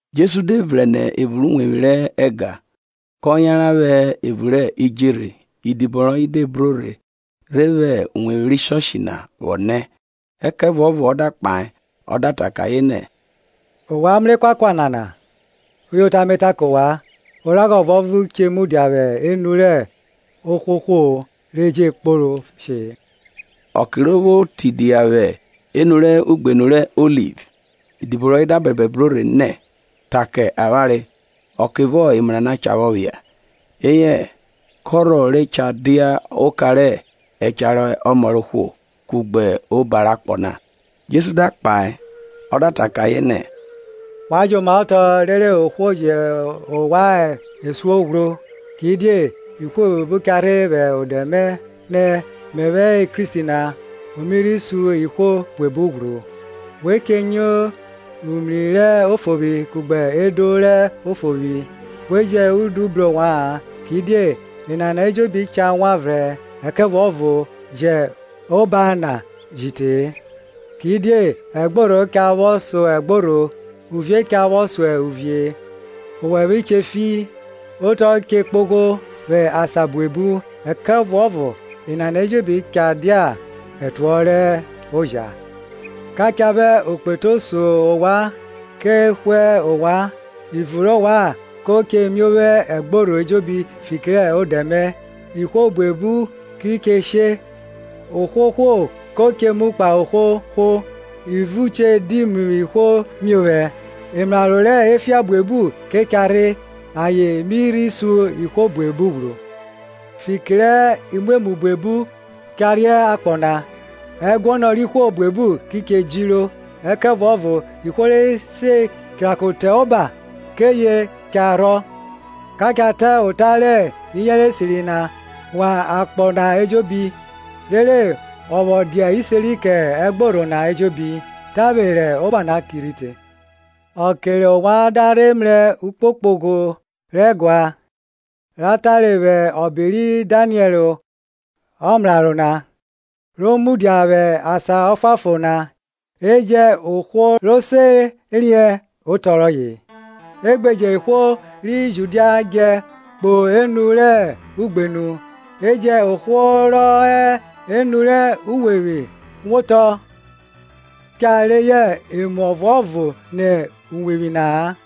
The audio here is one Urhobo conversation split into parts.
Jesu de vrẹn nẹ evun rẹ uwevwi rẹ ẹga na, kọ yanran vwẹ evun rẹ idjerhe; idibo rọye de bro rhe re vwẹ uwevwi rẹ ẹga na vwọ nẹ. Ẹkẹvuọvo ọ da kpahe ọ da ta kẹ ayen nẹ, Ovwan mrẹ ekuakua nana? uyota me ta kẹ ovwan, Oragha ọvuọvo che mudia vwẹ enu rẹ ohwohwo, re je kporo she-e. Ọke ro vwo tidia vwẹ enu rẹ ugbenu rẹ Oliv, idibo rọye da bẹbẹ bro rhe nẹ, ta kẹ avwanre, ọkevọ emu nana cha vwọ phia? eyẹ kọrhọ re cha dia oka rẹ ẹcha rẹ ọmọ rẹ ohwo, kugbe oba rẹ akpọ na? Jesu da kpahe ọ da ta kẹ ayen nẹ, Wa jomaotọ rere ohwo vwo jẹ ovwan esuo ghwro. Kidie ihwo buebu cha rhe vwẹ odẹ mẹ nẹ, Mẹvwẹ hẹ Kristi na; o mi rhi sun ihwo buebu ghwru. We che nyo umri rẹ ofovwi kugbe edo rẹ ofovwi. We jẹn udu bru ovwa-an, kidie enana ejobi cha wan vrẹn; ẹkẹvuọvo je oba na ji te-e. Kidie ẹgborho cha vwọ so ẹgborho, uvie cha vwọ so uvie, owẹvwe che fi, otọ che kpogho vwẹ asan buebu. Ẹkẹvuọvo enana ejobi ke cha dia ẹtuọhọ rẹ oja. Ka cha vwẹ okpetu so ovwan ke hwe ovwan; ivun rẹ ovwan ko che miovwo ẹgborho ejobi fiki rẹ odẹ mẹ. Ihwo buebu ki che she, ohwohwo ko che mu ohwohwo; ivun che di mu ihwo miovwẹ. Emraro rẹ efian buebu cha rhe, ayen mi rhi sun ihwo buebu ghwru. Fiki rẹ imwemwu buebu re cha rhe akpọ na, ẹguọnọ rẹ ihwo buebu ki che djiro. Ẹkẹvuọvo ihwo ri se chirako te oba, kẹ eye re cha rhọ. Ka cha ta ota rẹ iyẹnrẹ esiri na wan akpọ na ejobi, rere ọ vwọ dia iseri kẹ ẹgborho na ejobi; tavwe rẹ oba na ki rhi te. Ọke rẹ ovwan da rhe mrẹ ukpokpogho rẹ ẹgua, ra tare vwẹ ọbe ri Daniẹl ọmraro na, ro mudia vwẹ asan ọfuanfon na (e jẹn ohwo ro se riẹn otọ rọye), E gbe jẹn ihwo ri Judia djẹ kpo enu rẹ igbenu. E jẹn ohwo rọ hẹ enu rẹ uwevwi wotọ cha reyọ emu ọvuọvo nẹ uwevwi na-a.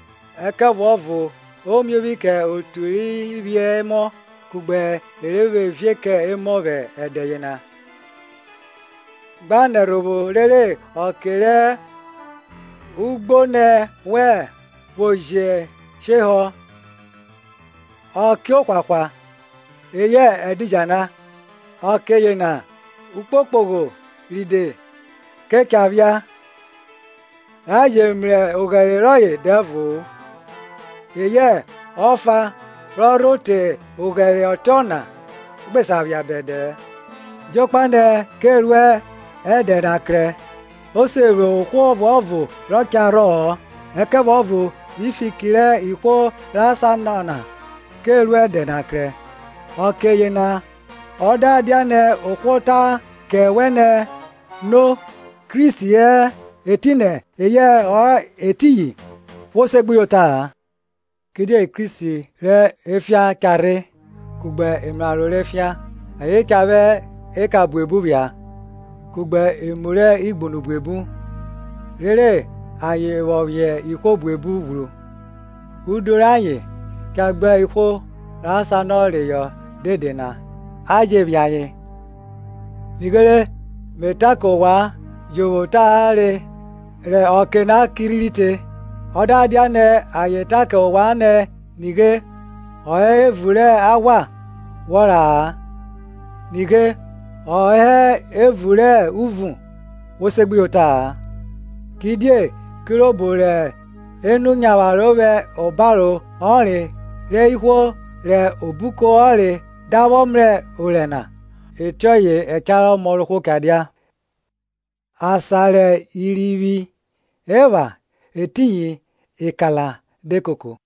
Ẹkẹvuọvo o miovwi kẹ eya vẹ evun kugbe e re vwẹ ivie kẹ emọ vwẹ ẹdẹ yena. Gba nẹ ẹrhovwo rere ọke rẹ ugbonẹ wẹn vwo je shehọ ọke rẹ ohwahwa, eyẹ ẹdidjala. Ọke yena ukpokpogho rode kọ cha phia, ra je mrẹ oghẹre rọye dẹvo-o, eyẹ ọfa ro rho te oghẹre ọtiọna gbe sa phia bẹdẹ-ẹ. Jokpa nẹ ke ru ẹdẹ na krẹ, o se vwo ohwo ọvuọvo rọ cha rhọ-ọ; ẹkẹvuọvo vwi fiki rẹ ihwo ra sanọre na, ke ru ẹdẹ na krẹ. Ọke yena ọ da dianẹ ohwo ta kẹ wẹ nẹ, No, Kristi hẹ etinẹ eyẹ ọ hẹ etiyin; wo segbuyota. Kidie Kristi rẹ efian cha rhe, kugbe emraro rẹ efian, ayen cha vwẹ eka buebu phia, kugbe emu rẹ igbunu buebu; rere ayen vwọ phiẹn ihwo buebu ghwru; udu rẹ ayen da gba ihwo ra sanọ reyọ dede na, a jẹ phiẹn ayen. Nighere me ta kẹ ovwan jovwo tavwe rẹ ọke na ki rhi te. Ọ da dianẹ ayen ta kẹ ovwan nẹ, Nighe, ọ hẹ evun rẹ aghwa; wọ ra-a, Nighe, ọ hẹ evun rẹ uvun, wo segbuyota-a. Kidie kirobo rẹ enu nyavwaro vwẹ obaro ọnre rẹ ihwo rẹ obuko ọnre da vwọ mrẹ orẹ na, ọtiọye ẹcha rẹ ọmọ rẹ ohwo cha dia. Asan rẹ irivwi epha etiyin ekala de koko.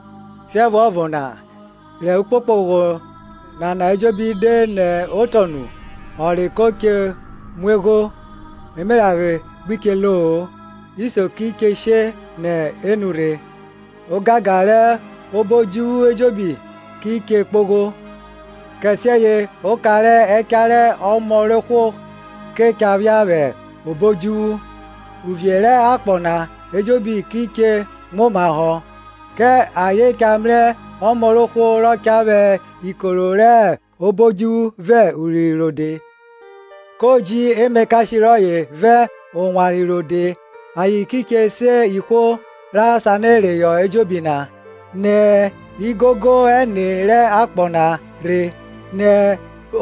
Siẹvuọvo na, rẹ ukpokpogho nana ejobi de nẹ otọ nu, ọnre ko che muegho, emeranvwe gbi che lo-o, isio ki che she nẹ enu rhe, ogangan rẹ obo odjuvwu ejobi ki che kpogho; Kẹsiẹye oka rẹ ẹcha rẹ ọmọ rẹ ohwo ke cha phia vwẹ obo odjuvwu, uvie rẹ akpọ na ejobi ki che muomahọ, kẹ ayen cha mrẹ ọmọ rẹ ohwo rọ cha vwẹ ikoro rẹ obo odjuvwu vẹ urinrin rode. Ko ji emakashe rọye vẹ owanre rode, ayen ki che se ihwo ra sanọ reyọ ejobi na, nẹ igogo ẹne rẹ akpọ na rhe, nẹ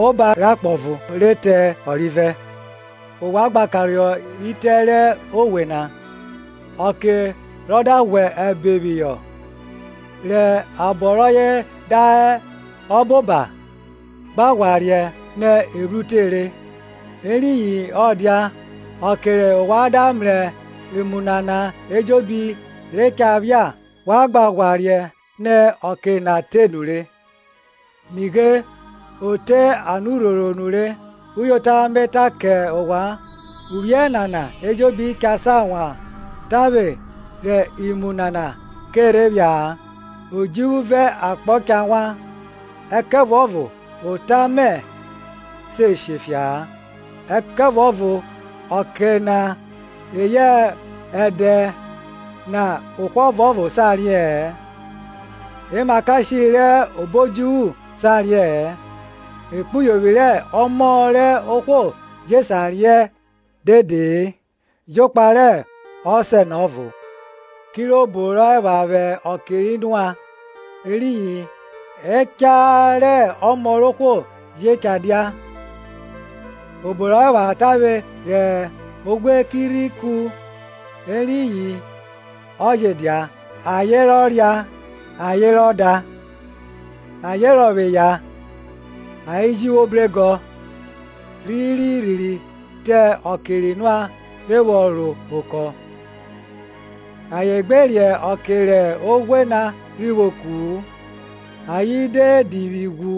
oba rẹ akpọ ọvo re te ọrivẹ. Ovwan gba karohọ itẹ rẹ owe na; ọke rọ da ghwẹ ẹbe phihọ, rẹ eghọn rọye da hẹ ọboba, gba ghwa riẹn nẹ evwru rhire. Eriyin ọ dia, ọke rẹ ovwan da mrẹ emu nana ejobi re cha phia, wa gba ghwa riẹn nẹ ọke na te nure, nighe o te anurhoro nure. Uyota me ta kẹ ovwan, uvwiẹ nana ejobi cha sa wan tavwe, re imu nana ke rhe phia-a. Odjuvwu vẹ akpọ cha wan, ẹkẹvuọvo ota mẹ se she fia-a. Ẹkẹvuọvo ọke na eyẹ ẹdẹ na ohwo ọvuọvo sa riẹ-ẹn, emakashe rẹ obo odjuvwu sa riẹ-ẹn, ekpuyovwi rẹ Ọmọ rẹ ohwo je sa riẹn dede-e, jokpa rẹ Ọsẹ na ọvo. Kirobo rọ epha vwẹ ọke ri Noa, eriyin ẹcha rẹ Ọmọ rẹ ohwo je cha dia. Obo rọ epha tavwe rẹ oghwe na ki rhi ku eriyin ọ je dia; ayen rọ ria ayen rọ da, ayen rọvwọ eya ayen ji vwo bregọ, rhiri rhi te ọke ri Noa rhe vwọ ro okọ na. Ayen gbe riẹn ọke rẹ oghwe na rhi vwo ku-u, ayen de divwi ghwu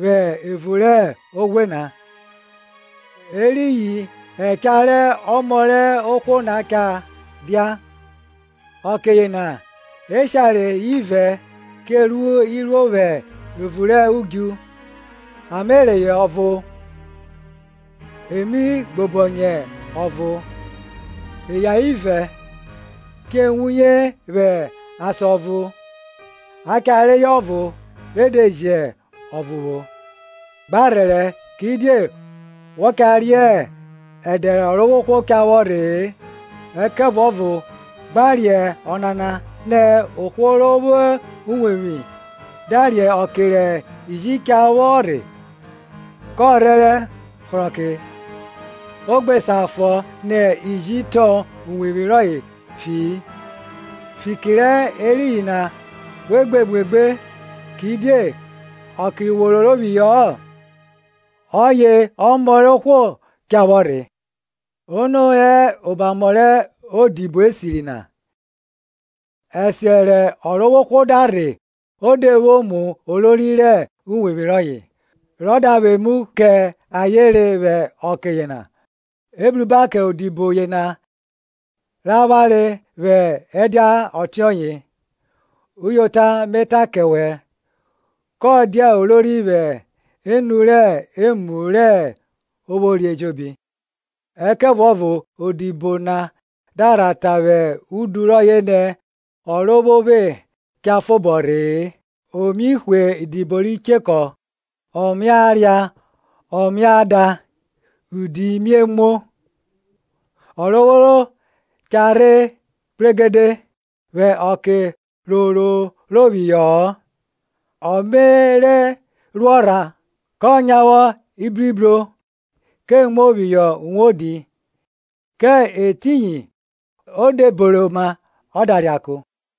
vwẹ evun rẹ oghwe na; eriyin ẹcha rẹ Ọmọ rẹ ohwo na cha dia. Ọke yena eshare ivẹ che ru iruo vwẹ evun rẹ udju, a me reyọ ọvo e mi gbobọnyẹ ọvo. Eya ivẹ che wuye vwẹ asan ọvo, a cha reyọ ọvo re de jẹ ọvo vwo. Gba rhẹrẹ; kidie wọ cha riẹn ẹdẹ rẹ Ọrovwohwo cha vwọ rhe-e. Ẹkẹvuọvo gba riẹn onana nẹ, ohwo ro vwo uwevwi da riẹn ọke rẹ iji cha vwọ rhe, kọ rhẹrẹ hrọke, ọ gbe sa fọ nẹ iji tọn uwevwi rọye fi-i. Fiki rẹ eriyin na we muegbe: kidie ọke wo roro phihọ-ọ, ọye Ọmọ rẹ ohwo cha vwọ rhe. Ono hẹ omamọ rẹ odibo esiri na, rẹ ẹsiẹ rẹ ọrovworo da rhe o de vwo mu olori rẹ uwevwi rọye, rọ da vwẹ emu kẹ ayen re vwẹ ọke yena? Ebruba kẹ odibo yena ra vware vwẹ ẹdia ọtiọye. Uyota me ta kẹ wẹ, kọ dia olori vwẹ enu rẹ emu ro vwori ejobi. Ẹkẹvuọvo odibo na da rha ta vwẹ udu rọye nẹ, Ọrovwovwe cha fobọ rhe-e. O mie hwe idibo ri chekọ, o mia ria, ọ mia da, idi mie muo; Ọrovworo cha rhe kpregede, vwẹ ọke ro roro phihọ-ọ, ọ me rhe ruọ ọrhan, kọ nyavwọ ibribro, ke muo phihọ uwodi, kẹ etiyin o de beroma ọ da reako.